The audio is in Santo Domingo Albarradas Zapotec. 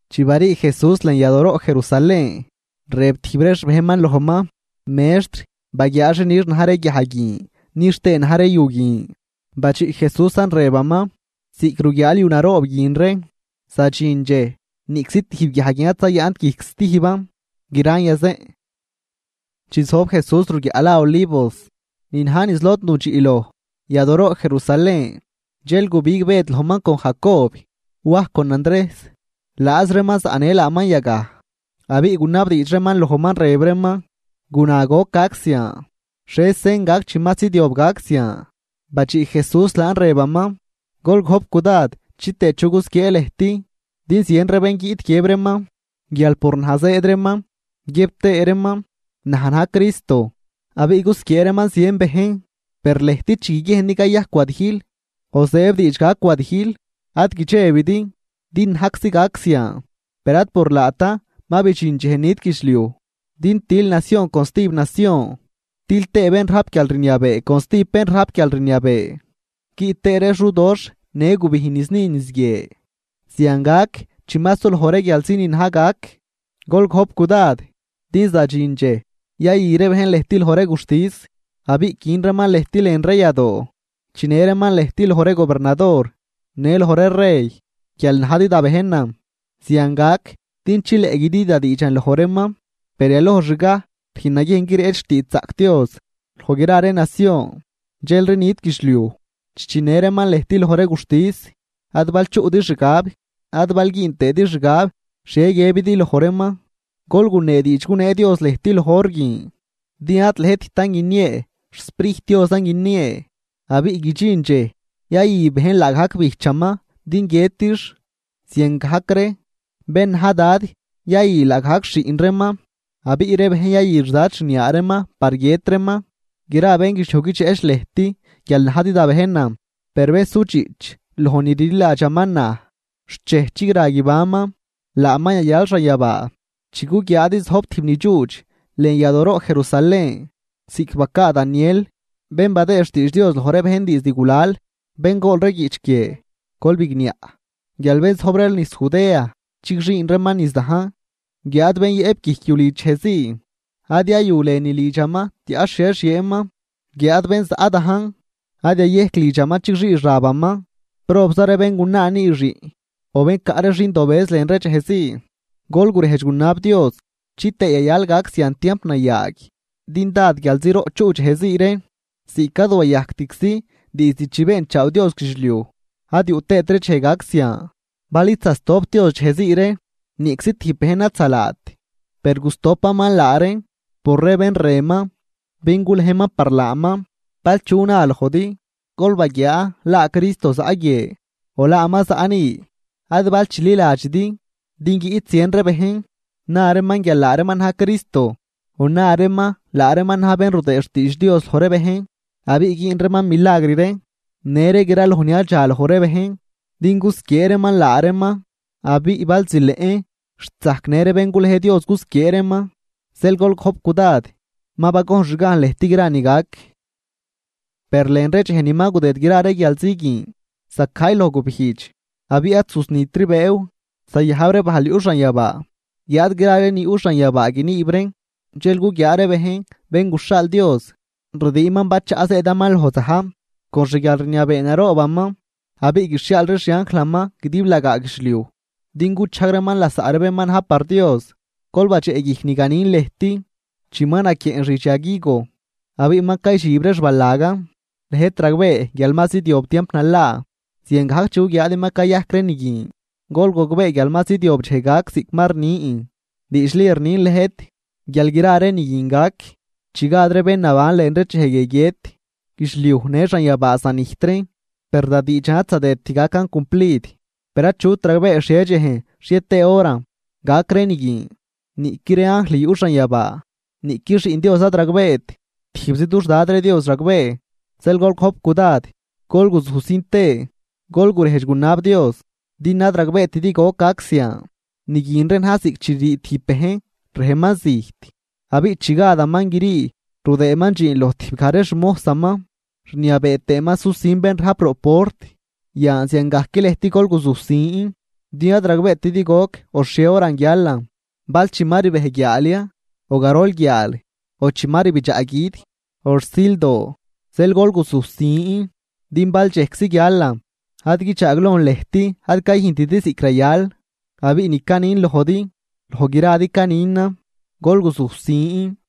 Chi barii Jesús lën yadooroꞌ Jerusalén, rëb tijb ree xbejnman lojman: ―Mextr, ¡baguiaa xi nix na̱j ree guiaj guin nix tëë na̱j ree yu guin! Badxiꞌ Jesúsan rëbaman: ―Ziꞌc ruguiaal yu naroob guin ree, zadxin dxej, niꞌczi tijb guiaj guin ad zayaꞌnt guijc stijban, gran yazeꞌn. Chi zojb Jesús ruguiaꞌ la Olivos, ni na̱j niz lod nudxiꞌ loj yadooroꞌ Jerusalén. Dxel gubig Bëd lojman con Jacob, Waj con Andrejs, laaz reeman zaꞌnë laaman yagaj, abiꞌ gunabdiidx reeman lojman, rëb reeman: ―Guna, ¿goc gac zian? ¿Xhie sen gac chi ma zidyob gac zian? Badxiꞌ Jesús laan rëbaman: ―Gol gojp cudad chitëë chu gusquiee lëjt. Din zien ree bén guiꞌt guiëb reeman guial por naj zëëd reeman, guiëb tëë reeman: “Naj na̱j Cristo”, abiꞌ gusquiee reeman zien bejn. ’Per lëjt chi guiguiejndi cayajc wadijl o zëëb diidx gac wadijl, ad guidxebidi; din najczi gac zian, per ad por laatan ma bidxin dxej nit guidxliuj. Din til nacion con stijb nacion, til tëë bén rajp guialrniabee con stijb bén rajp guialrniabee, guiꞌt tëë ree xudoxh në gubijn niz ni niz guie. Zian gac chi ma suloj ree guialzi ni na̱j gac. ’Gol gojp cudad, din zadxin dxej yayü ree bejn lëjt loj ree guxtis, abiꞌ quin reeman lëjt lën ree yadoo. Chinë reeman lëjt loj ree gobernador në loj ree rey guial najdi da bejnan, zian gac din chileꞌ güdi da diidxan loj reeman. Per yalojxgaj rüjn naguiejn guireꞌch xtiidxzaꞌc Dios loj gra ree nacion, dxelri nit guidxliuj. Chi chinë reeman lëjt loj ree guxtis, ad bal chuꞌdi xgab, ad bal güün tëëdi xgab xhie guiëbidi loj reeman. Gol gunee diidx gunee Dios lëjt loj hor guin. Din ad lëjttan guiniee, xSprijt Diosan guiniee. Abiꞌ guidxin dxej yayü bejn laagajc bijchaman din guiëtix, ziangajc ree bén na̱j dad yayü laagajc xiꞌn reeman, abiꞌ ree bejn yayü xdad xniaa reeman par guiët reeman. Gra bénguidxliuj guidxeꞌch lëjt guial najdi da bejnan, per bén sudxiꞌch loj ni rliladxaman naj xt dxej chigra guibanman, laaman yayal xanyabaa. ’Chi guguiaadi zojb tijb ni dxuudx lën yadooroꞌ Jerusalén, ziꞌc bacaa Daniel, bén badëë xtiidx Dios loj ree bejn diizd gulal (bén gool ree guiꞌch guie, gol bigniaꞌn), guial bén zojb ree niz Judea chigxüün reeman niz dajn. Guiáad bén yëꞌp guijc yu lidx dxejzii, ad yayu lënü lidxaman tiaꞌ xhie xieenman. Guiáad bén zaꞌ dajn, ad yayejc lidxaman chigxii xabaman. ¡Probza ree béngunaa nüü xiꞌn o bén caꞌ ree xindobëz lën ree dxej zii! Gol gurejdx gunab Dios chitëë yayal gac zian tiamp nayaag, din dád guialziroꞌ chuꞌ dxejzii ree, ziꞌc ad wayajctczi diizd chi beenchaaw Dios guidxliuj, ad yuꞌ tëëtri dxej gac zian. Bal id zasdop Dios dxej zii ree, niꞌczi tijb bejn ad zalaat, per gusdopaman laa reen, por ree bén rënman, bén gulejman par laaman. ’Bal chu na lojdi: “Gol baguiaa, laa Cristo zaꞌ guie”, o “laaman zaꞌ ni”, ad bal chililadxidi. Din guiꞌt zien ree bejn, na reeman guial laa reeman na̱j Cristo o na reeman laa reeman na̱j bén rudëë xtiidx Dios loj ree bejn, abiꞌ güün reeman milagr ree në ree graloj ni yadxaloj ree bejn, din gusquiee reeman laa reeman, abiꞌ bal zileꞌn xt zajc në ree bén gulej Dios gusquiee reeman. Zeel gol gojp cudad, ma bagojnxgajn lëjt gra ni gac. ’Per lën ree dxej ni ma gudëd gra ree guialzi guin, zacajy loj gubijdx abiꞌ ad zusnitri bëëw, zayajb ree bajl yuꞌ xanyabaa guiáad gra ree ni yuꞌ xanyabaa guiniib reen. Dxel guguiaa ree bejn Bén guxhaal Dios rdiinman bachaꞌ zëëdaman loj za̱j con xguialrniabee naroobaman. Abiꞌ guixhiaal ree xianjlaman guidiblagaa guidxliuj din guchajg reeman lasaꞌ ree bén ma na̱j par Dios. ’Gol badxeꞌguijc ni ganin lëjt: Chi ma naquieꞌn xidx yag higo abiꞌ ma caydxib ree xbalagan, lëjt ragbee guial ma zidyob tiamp nalaa. Ziangajc chi guguiaadi ma cayajc ree ni guin, gol gogbee guial ma zidyob dxej gac ziꞌc ma rnin. Diidxli rnin lëjt guial gra ree ni guin gac chi gad ree bén naban lën ree dxej guie guiët. Guidxliuj në xanyabaa zanijt reen, per da diidxan ad zadëdt gacan cumplid. ’Per achut ragbee xhie dxejn xhie tëë horan gac ree ni guin, niꞌqui ree anjl yuꞌ xanyabaa, niꞌqui Xiꞌn Dios ad ragbeet, tijbzi dux Dad ree Dios ragbee. ’Zeel gol gojp cudad, gol guzujsin tëë, gol gurejdx gunab Dios din ad ragbeetidi goc gac zian. Ni guin ree na̱j ziꞌc chi ririi tijb bejn rejman zijt. Abiꞌ chi gadaman grii rudëëman dxiin loj tijbgaj ree xmojsaman, rniabee tëëman susin bén rajp roꞌ port. Yan ziangajc lëjt gol guzujsin, din ad ragbeetidi goc o xhie horan guialan bal chi ma ribej guiaal ya, o garol guiaal, o chi ma rbidxaꞌ gui̱d, o rsildoo. Zeel gol guzusin din bal dxejczi guialan ad guidxaaglojn lëjt ad cayüjntidi ziꞌc rayal. Abiꞌ ni canin lojdi, loj gradi caninan: Gol guzujsin.